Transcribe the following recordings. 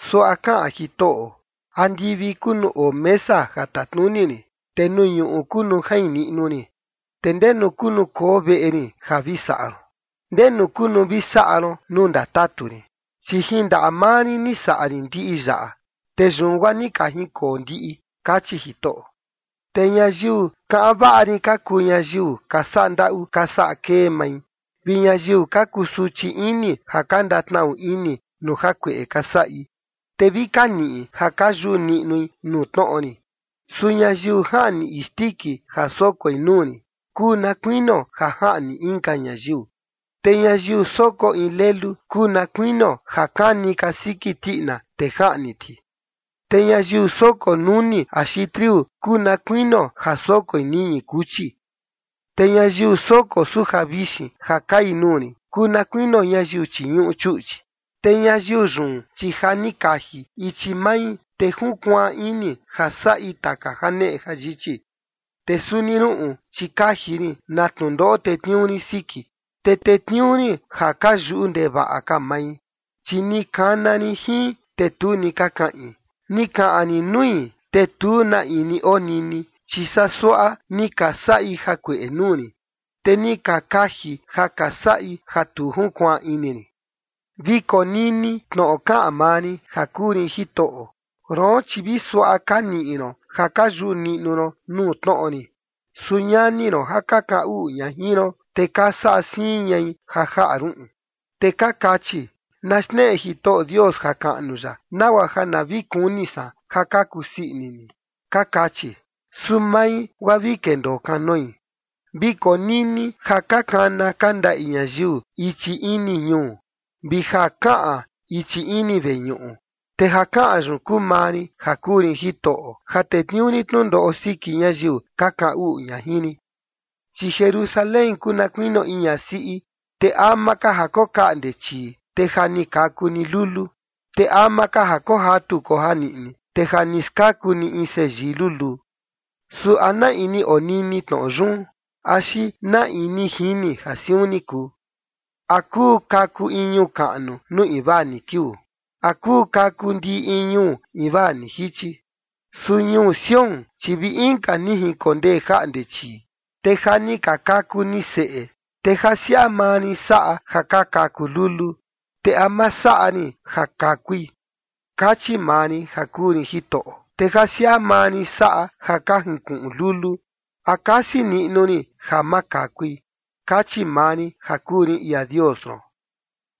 Suaꞌa kaꞌan Jitoꞌo: “Andivi kuu nuu oo mesa ja tatnuni rin, te nuu ñuꞌu kuu nuu jain niꞌnu rin. ¿Te ndenu kuu nuu koo veꞌe rin ja vi saꞌa ron? ¿Ndenu kuu nuu vi saꞌa ron nuu ndatatu rin? Chi jin ndaꞌa maa rin ni saꞌa rin ndiꞌi yaꞌa, te yun guaa ni ka jinkoo ndiꞌi”, kachi Jitoꞌo. “Te ñayiu kaꞌan vaꞌa rin ka kuu ñayiu ka saꞌa ndaꞌu ka saꞌa kee mai vi ñayiu ka kusuchi ini ja ka ndatnaꞌu ini nuu jakueꞌe ka saꞌi, te vi ka niꞌi ja ka yuꞌu niꞌnui nuu tnoꞌo rin. Su ñayiu jaꞌni isndiki ja sokoi nuu rin, kuu na kuinio ja jaꞌni inka ñayiu. Te ñayiu soko in lelu kuu na kuinio ja kani kasiki tiꞌina, te jaꞌni ti. Te ñayiu soko nuni axi triu kuu na kuinio ja sokoi ñiñi kuchi. Te ñayiu soko suja vixin ja kai nuu rin kuu na kuinio ñayiu chiñuꞌu chuꞌchi. Te ñayiu yun, chi ja ni kaji ichi mai, te junkuaan ini ja saꞌi taka janeꞌe jayichi. Te suni ruꞌun, chi kaji rin na tnundoꞌo tetniuu rin siki, te tetniuu rin ja ka yuꞌu ndevaꞌa ka mai, chi ni kana rin jin, te tu ni ka kaꞌin. Ni kaꞌan rin nui, te tu na in ni onini, chi saa suaꞌa ni ka saꞌi jakueꞌe nuu rin, te ni ka kaji ja ka saꞌi ja tu junkuaan ini rin.” Vi konini tnoꞌo kaꞌan maa rin ja kuu rin Jitoꞌo: “Roon, chi vi suaꞌa ka niꞌi ron ja ka yuꞌu niꞌnu ron nuu tnoꞌo rin, su ñani ron ja ka kaꞌan uꞌu ña jin ron, te ka saꞌa siin ñai ja jaꞌa ruꞌun, te ka kachi: Na xneꞌe Jitoꞌo Dios jakaꞌnu ya, nagua ja na vi kuni san ja ka kusii ini ni, ka kachi. Su mai, guaa vi ndendoo kanoi. Vi konini ja ka kana ka ndaꞌi ñayiu ichi ini ñuu, vi ja kaꞌan ichi ini veñuꞌu, te ja kaꞌan yun kuu maa rin ja kuu rin Jitoꞌo, ja tetniuu rin tnundoꞌo siki ñayiu ka kaꞌan uꞌu ña jin rin. ’Chi Jerusalén kuu na kuinio in ñasiꞌi, te ama ka ja kokaꞌnde chii, te ja ni kaku ni lulu. Te ama ka ja kojatu kojaniꞌni, te ja ni skaku ni in seyii luluu. Su ¿na in ni onini tnoꞌo yun? Axi ¿na in ni jini ja siun ni kuu? ¿A kuu kaku in ñuu kaꞌnu nuu invaa ni kiuu? ¿A kuu kaku ndiꞌi in ñuu invaa ni jichi? Su ñuu Sión, chi vi inka ni jinkondee jaꞌnde chii, te ja ni ka kaku ni seꞌe. Te ja siaꞌa maa rin saꞌa ja ka kaku lulu, te ¿a ma saꞌa rin ja kakui?”, kachi maa rin ja kuu rin Jitoꞌo. “Te ja siaꞌa maa rin saꞌa ja ka jinkuꞌun lulu, ¿A kasi niꞌnu rin ja ma kakui?”, kachi maa rin ja kuu rin ia Dios ron.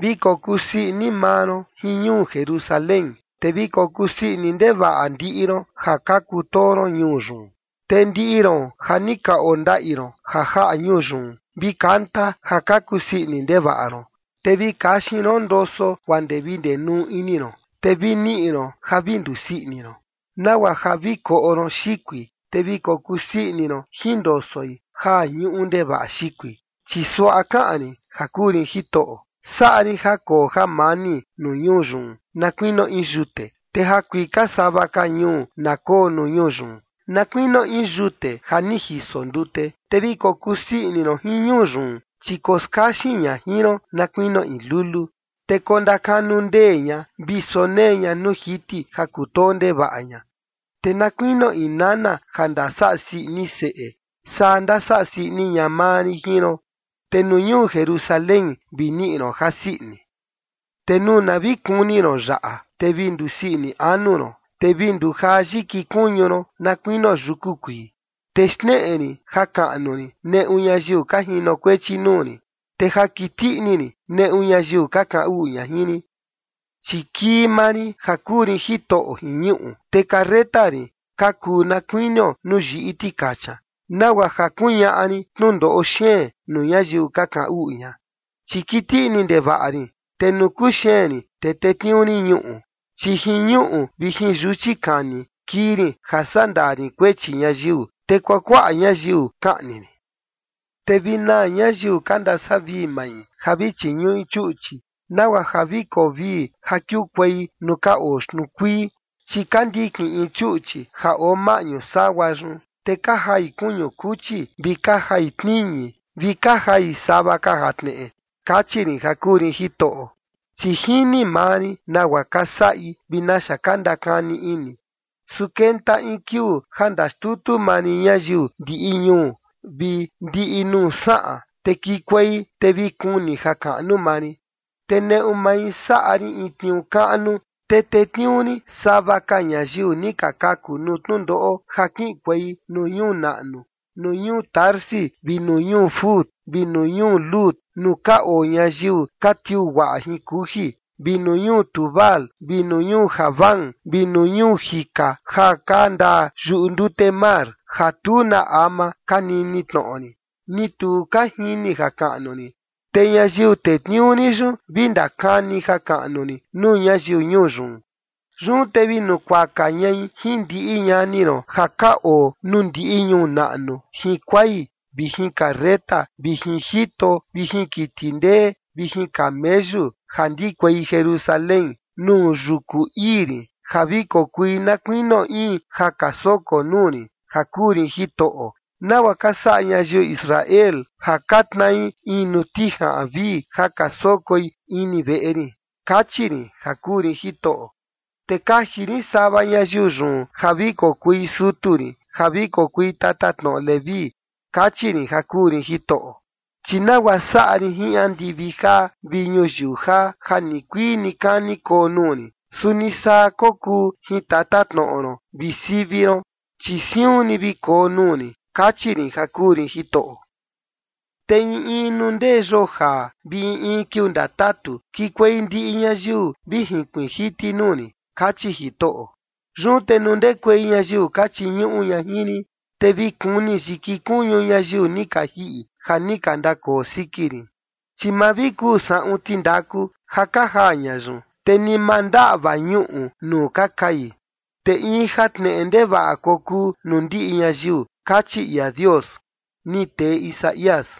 “Vi kokusii ini maa ron jin ñuu Jerusalén, te vi kokusii ini ndevaꞌa ndiꞌi ron ja ka kutoo ron ñuu yun. Te ndiꞌi ron ja ni ka ondaꞌi ron ja jaꞌa ñuu yun, vi kanta ja ka kusii ini ndevaꞌa ron. Te vi kaxin ron ndoso guaa ndee vi ndenuu ini ron, te vi niꞌi ron ja vi ndusii ini ron, nagua ja vi koꞌo ron xikui, te vi kokusii ini ron jin ndosoi ja ñuꞌu ndevaꞌa xikui.” Chi suaꞌa kaꞌan rin ja kuu rin Jitoꞌo: “Saꞌa rin ja koo jamani nuu ñuu yun na kuinio in yute, te jakuika sava ka ñuu na koo nuu ñuu yun na kuinio in yute ja ni jiso ndute. Te vi kokusii ini ron jin ñuu yun, chi koskaxin ña jin ron na kuinio in lulu, te kokanundee ña vi kosonee ña nuu jiti ja kutoo ndevaꞌa ña. Te na kuinio in nana ja ndasaꞌa sii ini seꞌe, saa ndasaꞌa sii ini ña maa rin jin ron, te nuu ñuu Jerusalén vi niꞌi ron jasii ini. ’Te nuu na vi kuni ron yaꞌa, te vi ndusii ini anu ron, te vi ndujaa yiki kuñu ron na kuinio yuku kuii, te xneꞌe rin jakaꞌnu rin neꞌu ñayiu ka jinokuechi nuu rin, te ja kiti ini rin neꞌu ñayiu ka kaꞌan uꞌu ña jin rin. Chi kii maa rin ja kuu rin Jitoꞌo jin ñuꞌu, te carreta rin ka kuu na kuinio nuu yiꞌi tikacha, nagua ja kuñaꞌa rin tnundoꞌo xeen nuu ñayiu ka kaꞌan uꞌu ña, chi kiti ini ndevaꞌa rin, te nuu kuxeen rin, te tetniuu rin ñuꞌu. Chi jin ñuꞌu vi jin yuchi kani kii rin ja sandaa rin kuechi ñayiu, te kuakuaꞌa ñayiu kaꞌni rin. ’Te vi naa ñayiu ka ndasavii mai ja vi chiñuꞌi chuꞌchi, nagua ja vi koo vii ja kiukuei nuu ka oo xtnuu kuii, chi ka ndikin in chuꞌchi ja oo maꞌñu sagua yun, te ka jai kuñu kuchi vi ka jai tniñi vi ka jai sava ka jatneꞌe”, kachi rin ja kuu rin Jitoꞌo. “Chi jini maa rin nagua ka saꞌi vi naxa ka ndakani ini, su kenta in kiuu ja ndaxtutu maa rin ñayiu ndiꞌi ñuu vi ndiꞌi nuu saꞌan, te kikuei te vi kuni jakaꞌnu maa rin. Te neꞌu mai saꞌa rin in tniuu kaꞌnu, te tetniuu rin sava ka ñayiu ni ka kaku nuu tnundoꞌo ja kiꞌinkuei nuu ñuu naꞌnu, nuu ñuu Tarsis, vi nuu ñuu Fut, vi nuu ñuu Lud, nuu ka oo ñayiu ka tiuu guaꞌa jin kuji, vi nuu ñuu Tubal vi nuu ñuu Javán vi nuu ñuu jika ja ka ndaa yuꞌu ndute mar ja tu na ama ka nini tnoꞌo rin, ni tu ka jini jakaꞌnu rin. Te ñayiu tetniuu rin yun vi ndakani jakaꞌnu rin nuu ñayiu ñuu yun. Yun te vi nukuaka ñai jin ndiꞌi ñani ron ja ka oo nuu ndiꞌi ñuu naꞌnu jin kuai vi jin carreta vi jin jito vi jin kiti ndee vi jin kameyu ja ndikuei Jerusalén nuu yuku ii rin ja vi kokui na kuinio in ja ka soko nuu rin ja kuu rin Jitoꞌo, nagua ka saꞌa ñayiu Israel ja ka tnai in nuu tijaꞌan vii ja ka sokoi ini veꞌe rin, kachi rin ja kuu rin Jitoꞌo. Te kaji rin sava ñayiu yun ja vi kokui sutu rin ja vi kokui tatatnoꞌo Leví”, kachi rin ja kuu rin Jitoꞌo. “Chi nagua saꞌa rin jin andivi jaa vi ñuyiu jaa ja nikuii nikani koo nuu rin, suni saa kokuu jin tatatnoꞌo ron vi sivi ron, chi siun ni vi koo nuu rin”, kachi rin ja kuu rin Jitoꞌo. “Te in in nuu ndee yoo jaa vi in in kiuu ndatatu, kikuei ndiꞌi ñayiu vi jinkuiin jiti nuu rin”, kachi Jitoꞌo. “Yun te nuu ndekuei ñayiu ka chiñuꞌu ña jin rin, te vi kuni yiki kuñu ñayiu ni ka jiꞌi ja ni ka ndakoo siki rin, chi ma vi kuu saꞌun tindaku ja ka jaa ña yun, te ni ma ndaꞌva ñuꞌu nuu ka kai, te in jatneꞌe ndevaꞌa kokuu nuu ndiꞌi ñayiu”, kachi ia Dios. Ni tee Isaías.